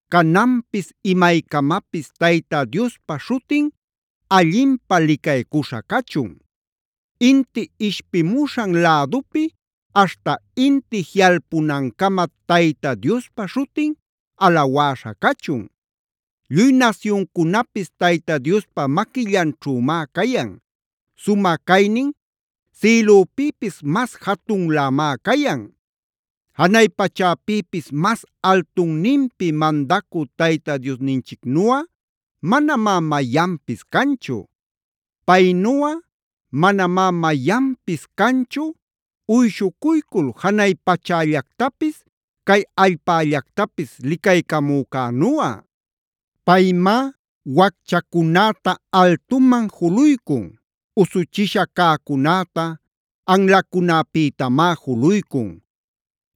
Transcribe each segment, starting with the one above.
Cananpis imaycamapis Tayta Diospa śhutin allinpä licaycuśha cachun. Inti ishpimuśhan lädupi aśhta inti jiꞌalpunancama Tayta Diospa śhutin alawäśha cachun. Lluy nasyuncunapis Tayta Diospa maquillanćhümá cayan. Sumä caynin sïlüpïpis mas jatunlämá cayan. Janay pachäpïpis mas altunninpi mandacü Tayta Diosninchicnuꞌa manamá mayanpis canchu. Paynuꞌa manamá mayanpis canchu, uyshucuycul janay pachällactapis cay allpällactapis licaycamücänuꞌa. Paymá wacchacunäta altuman juluycun, usuchisha cäcunäta anlacunäpïtamá juluycun.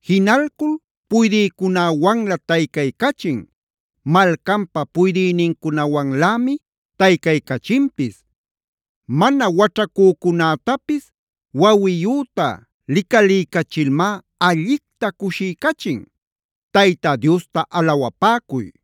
Jinalcul puydïcunäwanlä taycaycachin, malcanpa puydïnincunawanlämi taycaycachinpis. Mana waćhacücunätapis wawiyüta licaliycachilmá, allicta cushiycachin.a ¡Tayta Diosta alawapäcuy!